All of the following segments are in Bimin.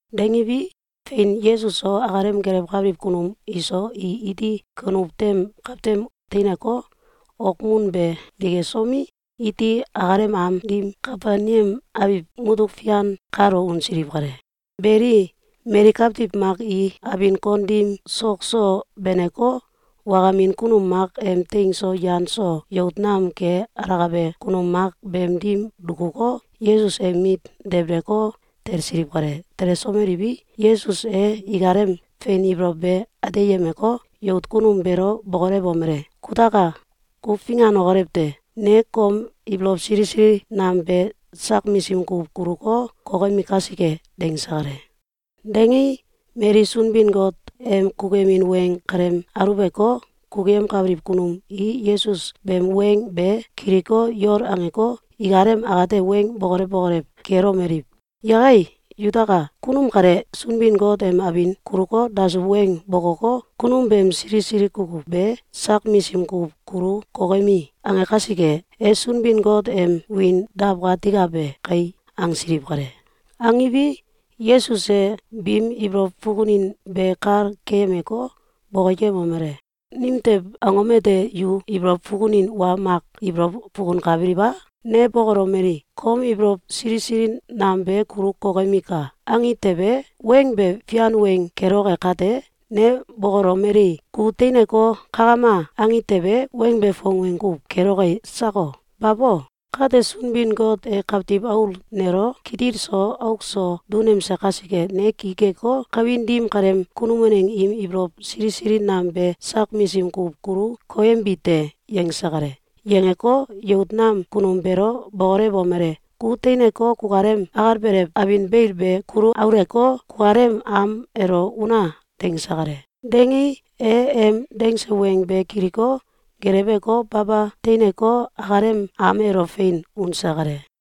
Dangiwi, fein, Yesus so akalem gelewkabiliw kunum iso i iti kunuw tem kawtem teineko, okmun be dikesomi, iti akalem am dim Kafelneam abiw mutuk fian kalo unsiliw kale. Beli, mali kawtiw mak i abin kon dim sok so beneko, wakamin kunum mak em teing so yan so yout nam ke alakabe kunum mak beem dim dukuko, Yesus em mit debeleko, talsiliw kale. Telesomeliwi, Yesus e ikalem fein ibolow be ateyemeko, yout kunum beelo bokolewomele: “Kutaka! Ku finganokolew te! Ne kom ibolow sili sili nam be sak misim kuw kuluko, kokemi kasike.”, dangse kale. Dangei, mali Sunbin-Got em kukuyemin weng kalem aulewko, kukuyemkabiliw kunum i Yesus beem weng be kiliko, yol angeko, ikalem akate weng bokolew bokolew kelomeliw: “Yakai yutaka! Kunum kale Sunbin-Got em abin kuluko, dasuw weng bokoko, kunum beem sili sili kukuw be ‘Sak misim kuw kulu kokemi!’, ange kasike, e Sunbin-Got em wiin dawkatikabe kai!”, angsiliw kale. Angiwi, Yesus e biim ibolow fukunin be kal keyemeko, bokoyemomele: “Nimtew angom ete yu ibolow fukunin wa mak ibolow fukunkabiliw a? Ne bokolomeli: ‘Kom ibolow sili nam be kulu kokemika!’, angi tewe, weng be fian weng keloke kate, ne bokolomeli: ‘Ku teineko, kakama!’, angi tewe, weng be fong weng kuw keloke sako? Babo! Kate, Sunbin-Got e Kawtiw Aul nelo kitil so auk so dunemse kasike, ne ki keko, kawin dim kaleem kunum waneng im ibolow sili sili nam be sak misim kuw kulu koyembi te.”, yangse kale. Yangeko, yout nam kunum beelo bokolewomele: “Ku teineko, kukalem akalbelew abin beil be kulu auleko, kukalem am elo una!”, dangse kale. Dangei, e em dangse weng be kiliko, geleweko, baba teineko, akalem am elo fein unse kale.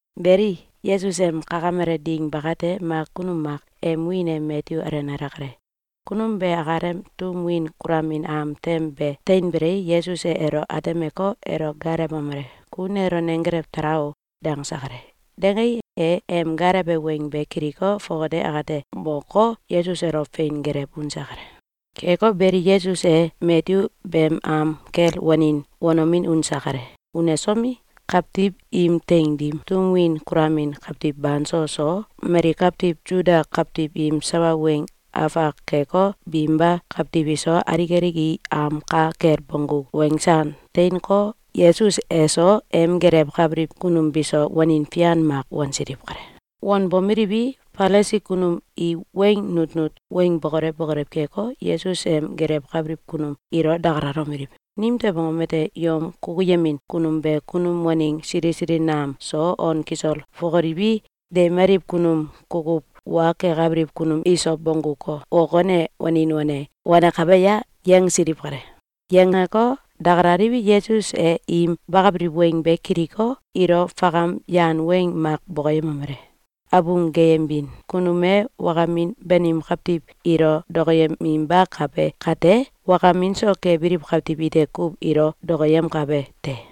Beli, Yesus em kakamele ding bakate, mak kunum mak em wiin e Matyu alenale kale. Kunum be akalem tum win kulamin am tem be teinbelei, Yesus e elo atemeko, elo gaalewomele: “Ku nelo nenggelew tala o!”, dangse kale. Dangei, e em gaalewe weng be kiliko, fongate akate moko, Yesus elo fein gelew unse kale. Keko beli, Yesus e Matyu beem am kel wanin wanomin unse kale. Unesomi, kawtiw im teing dim tum win kulamin kawtiw banso so, mali kawtiw Suda kawtiw im sawa weng afak keko, binba kawtiw iso, alik alik i am ka kel bonggu wensan teineko, Yesus eso em gelewkabiliw kunum biso, wanin fian mak wansiliw kale. Wanbomeliwi, Falisi kunum i weng nutnut weng bokolew bokolew keko, Yesus em gelewkabiliw kunum ilo dakalalomeliw: “Nimtew angom ete yom kukuyemin kunum be kunum waneng sili sili nam so, on kisol fokoliwi, deimaliw kunum kukuw wa kekabiliw kunum iso, bongguko, ok wane, wanin wane wanakabe a?”, yangsiliw kale. Yangeko, dakalaliwi, Yesus e im bakabiliw weng be kiliko, ilo fakam yan weng mak bokoyemomele: “Abung geyembin kunum e wakamin banim kawtiw ilo dokoyeminbakabe kate, wakamin so kebiliw kawtiw ite kuw ilo dokoyemkabe te.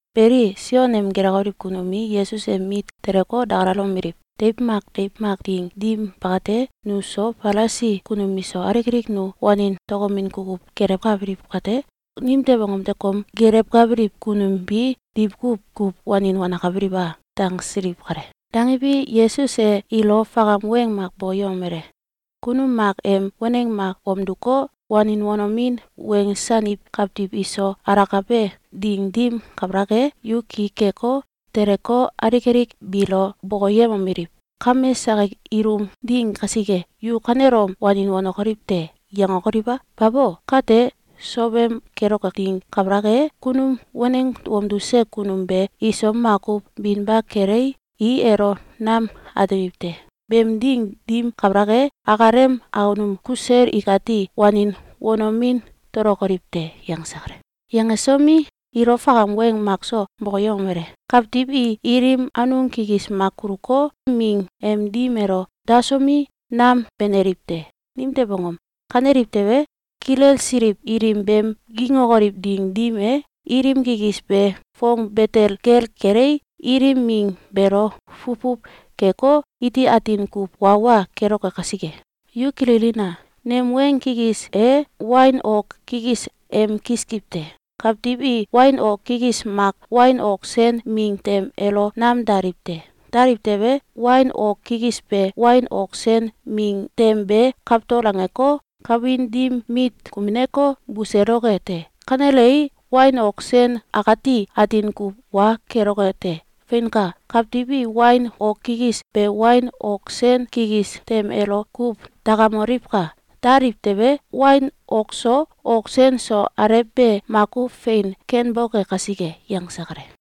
Beli, Sion em gelewkabiliw kunum i Yesus em mit teleko, dakalalomeliw: “Deiw mak deiw mak ding dim bakate, nu so, Falisi kunum iso, alik alik nu wanin tokomin kukuw gelewkabiliw kate, nimtew angom ete kom gelewkabiliw kunum bi diwkuw kuw wanin wanenkabiliw a?”, dangsiliw kale. Dangiwi, Yesus e ilo fakam weng mak bokoyemomele: “Kunum mak em waneng mak wamduko, wanin wanomin wensaniw kawtiw iso alakabe ding dim kabalak e, yu ki keko, teleko, alik alik biilo bokoyemomeliw: ‘Kame sakik ilum ding kasike, yu kanelom wanin wanokoliw te!’, yangokoliw a? Babo! Kate sowem keloke ding kabalak e, kunum waneng wamduse kunum be iso makuw binba kelei, i elo nam atemiw te. Beem ding dim kabalak e, akalem akunum kusel ikati wanin wanomin tokolokoliw te.”, yangse kale. Yangesomi, ilo fakam weng makso bokoyemomele: “Kawtiw i ilim anung kikis mak kuluko, ming em dim elo dasomi, nam beneliw te. Nimtew angom? Kaneliw tewe, kilelsiliw ilim beem gingokoliw ding dim e, ilim kikis be fong betel gel kelei, ilim ming beelo fuwfuw keko, iti atin kuw wa wa keloke kasike. Yu kililina! Nem weng kikis e wain ok kikis em kiskiw te. Kawtiw i wain ok kikis mak wain ok sen ming tem elo nam daliw te. Daliw tewe, wain ok kikis be wain ok sen ming tem be kawtol angeko, kawin dim mit kumineko, buseloke te. Kanelei, wain ok sen akati atin kuw wa keloke te. Feinka! Kawtiw i wain ok kikis be wain ok sen kikis tem elo kuw dakamoliwka! Daliw tewe, wain ok so, ok sen so, alew be makuw fein kenboke kasike.”, yangse kale.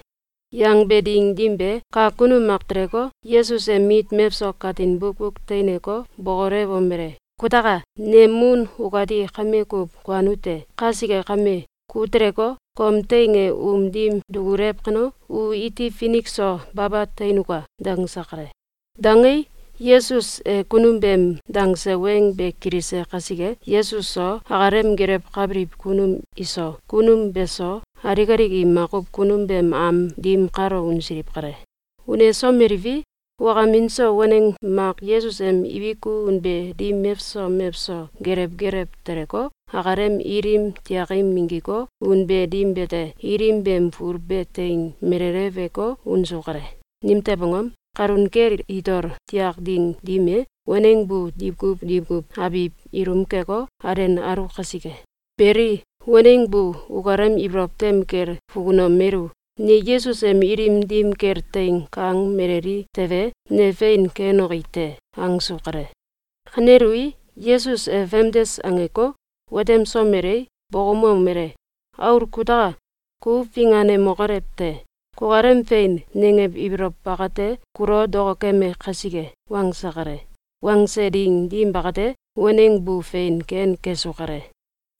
Yangbe ding dim be, kak kunum mak teleko, Yesus em mit mewso katin bukbuk teineko, bokolewomele: “Kutaka! Nem mun ukati kame kuw kuanu te. Kasike kame, ku teleko, kom teing e um dim dukulew kano, u iti finik so baba teinuka!”, dangse kale. Dangei, Yesus e kunum beem dangse weng be kilise kasike, Yesus so, akalem gelewkabiliw kunum iso, kunum beso, alik alik i makuw kunum beem am dim kalo unsiliw kale. Unesomeliwi, wakamin so waneng mak Yesus em ibiku unbe dim mewso mewso gelew gelew teleko, akalem ilim tiakim minggiko, unbe dim bete, ilim beem ful be teing meleleweko, unsu kale. Nimtew angom? Kalun kel itol tiak ding dim e, waneng bu diwkuw diwkuw abiw ilum keko, alenalu kasike. Beli, waneng bu ukalem ibolow tem kel fukunomelu: “Ne Yesus em ilim dim kel teing kang meleli tewe, ne fein kenoki te!”, angsu kale. Kanelui, Yesus e famdes angeko, watemsomelei, bokoumomele: “Aul kutaka! Ku finganemokolew te! Kukalem ‘Fein!’, nangew ibolow bakate, kulo dokokeme kasike.”, wangse kale. Wangse ding dim bakate, waneng bu fein ken kesu kale.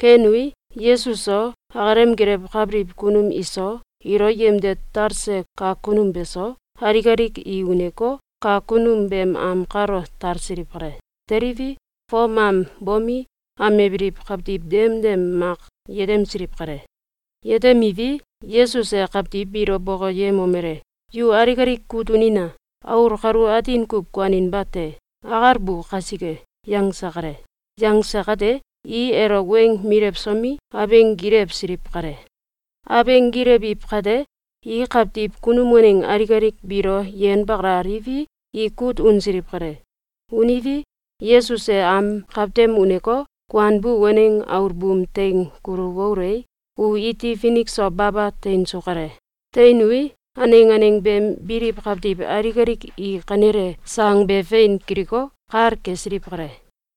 Kenui, Yesus so, akalem gelewkabiliw kunum iso, ilo yemde talse kak kunum beso, alik alik i uneko, kak kunum beem am kalo talsiliw kale. Teliwi, fom am bomi, amebiliw kawtiw demdem mak yetemsiliw kale. Yetemiwi, Yesus e kawtiw biilo bokoyemomele: “Yu alik alik kut unina! Aul kalu atin kuw kuaninba te. Akalbu kasike!”, yangse kale. Yangse kate, i elo weng milewsomi, abeng gilewsiliw kale. Abeng gilewiw kate, i kawtiw kunum waneng alik alik biilo yenbakalaliwi, i kut unsiliw kale. Uniwi, Yesus e am kawtem uneko, kuanbu waneng aul buum teing kulu waulei, u iti finik so baba teinsu kale. Teinui, aneng aneng beem biliw kawtiw alik alik i kanele sang be fein kiliko, kal kesiliw kale.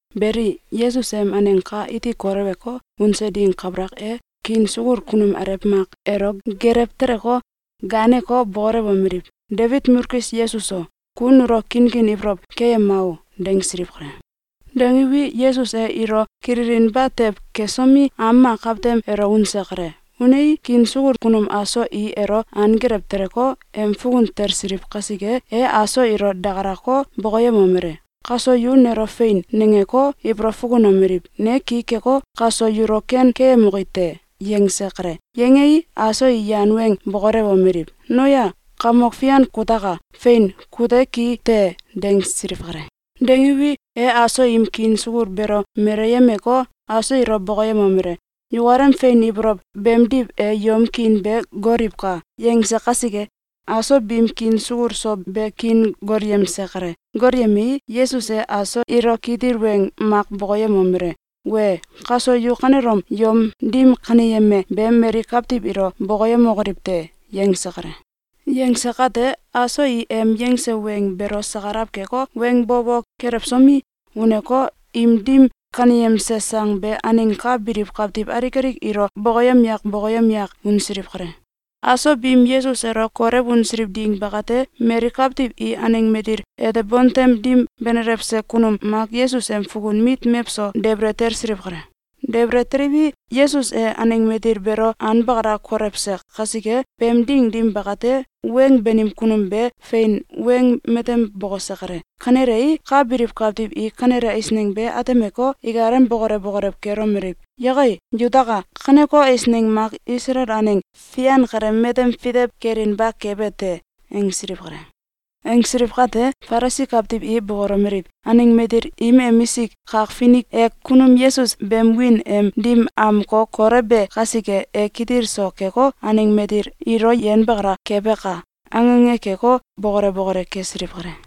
Beli, Yesus em aneng ka iti koleweko, unse ding kabalak e, kiin sukul kunum alew mak elo gelew teleko, gaaneko, bokolewomeliw: “Debit mulkis Yesus o! Ku nulo kinkin ibolow keyema o!”, dangsiliw kale. Dangiwi, Yesus e ilo kililinba tew kesomi, am mak kawtem elo unse kale. Unei, kiin sukul kunum aso i elo anggelew teleko, em fukun talsiliw kasike, e aso ilo dakalako, bokoyemomele: “Kaso yu nelo ‘Fein!’, nangeko, ibolow fukunomeliw: Ne ki keko, kaso yulo ken keyemoki te?”, yangse kale. Yangei, aso i yan weng bokolewomeliw: “Noya! Kamok Fian kutaka! Fein! Kute ki te!”, dangsiliw kale. Dangiwi, e aso im kiin sukul beelo meleyemeko, aso ilo bokoyemomele: “Yukalem fein ibolow beemdiw e yom kiin be goliwka!”, yangse kasike, aso biim kiin sukul so be kiin golyemse kale. Golyemei, Yesus e aso ilo kitil weng mak bokoyemomele: “Wee! Kaso yu kanelom yom dim kaneyeme be mali kawtiw ilo bokoyemokoliw te!”, yangse kale. Yangse kate, aso i em yangse weng beelo sakalaw keko, weng bo bo kelewsomi, uneko, im dim kaneyemse sang be aneng ka biliw kawtiw alik alik ilo bokoyem yak bokoyem yak unsiliw kale. Aso biim Yesus elo kolew unsiliw ding bakate, mali kawtiw i aneng matil ete bontem dim benelewse kunum mak Yesus em fukun mit mewso debele talsiliw kale. Debele teliwi, Yesus e aneng matil beelo anbakala kolewse kasike, beem ding dim bakate, weng banim kunum be fein weng matem bokose kale. Kanelei, ka biliw kawtiw i kanele eisneng be atemeko, ikalem bokolew bokolew kelomeliw: “Yakai, yutaka! Kaneko eisneng mak Isalael aneng fian kale matem fitew kelinba kabe te!”, angsiliw kale. Angsiliw kate, Falisi kawtiw i bokolomeliw: “Aneng matil im emisik kak finik e kunum Yesus beem wiin em dim amko kolewbe kasike, e kitil so keko, aneng matil ilo yenbakala kebaka!”, ange ange keko, bokole bokole kesiliw kale.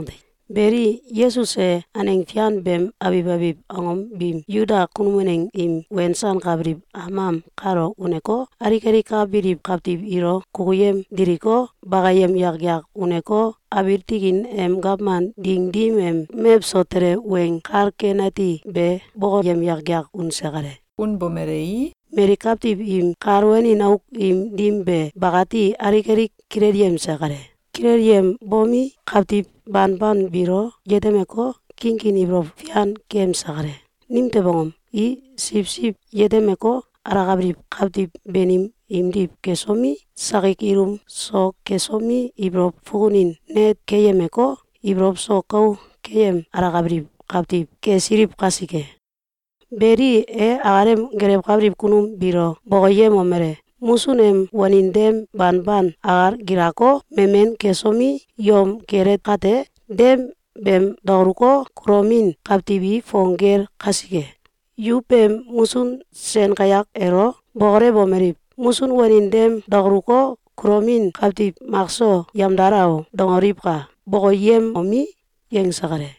Beli, Yesus e aneng fian beem abiw abiw angom biim Suda kunum waneng im wensankabiliw am am kalo uneko, alik alik ka biliw kawtiw ilo kukuyem diliko, bakayem yak yak uneko, abiil tikin em gawman ding dim em mewso tele Weng Kal Ken Ati be bokoyem yak yak unse kale. Unbomelei, mali kawtiw im kal wanin auk im dim be bakati alik alik kilelyemse kale. Kilelyembomi, kawtiw banban biilo yetemeko, kinkin ibolow fian keyemse kale. Nimtew angom? I siwsiw yetemeko, alakabiliw kawtiw banim imdiw kesomi, sakik ilum so kesomi, ibolow fukunin net keyemeko, ibolow so kou keyem alakabiliw kawtiw kesiliw kasike. Beli, e akalem gelewkabiliw kunum biilo bokoyemomele: “Musun em wanin dem banban akal gilako, memen kesomi, yom kele kate, dem beem dakaluko, kulomin kawtiw i fong gel kasike, yu beem musun sen kayak elo bokolewomeliw: ‘Musun wanin dem dakaluko, kulomin kawtiw makso yemdala o!’, dangoliwka!”, bokoyemomi, yangse kale.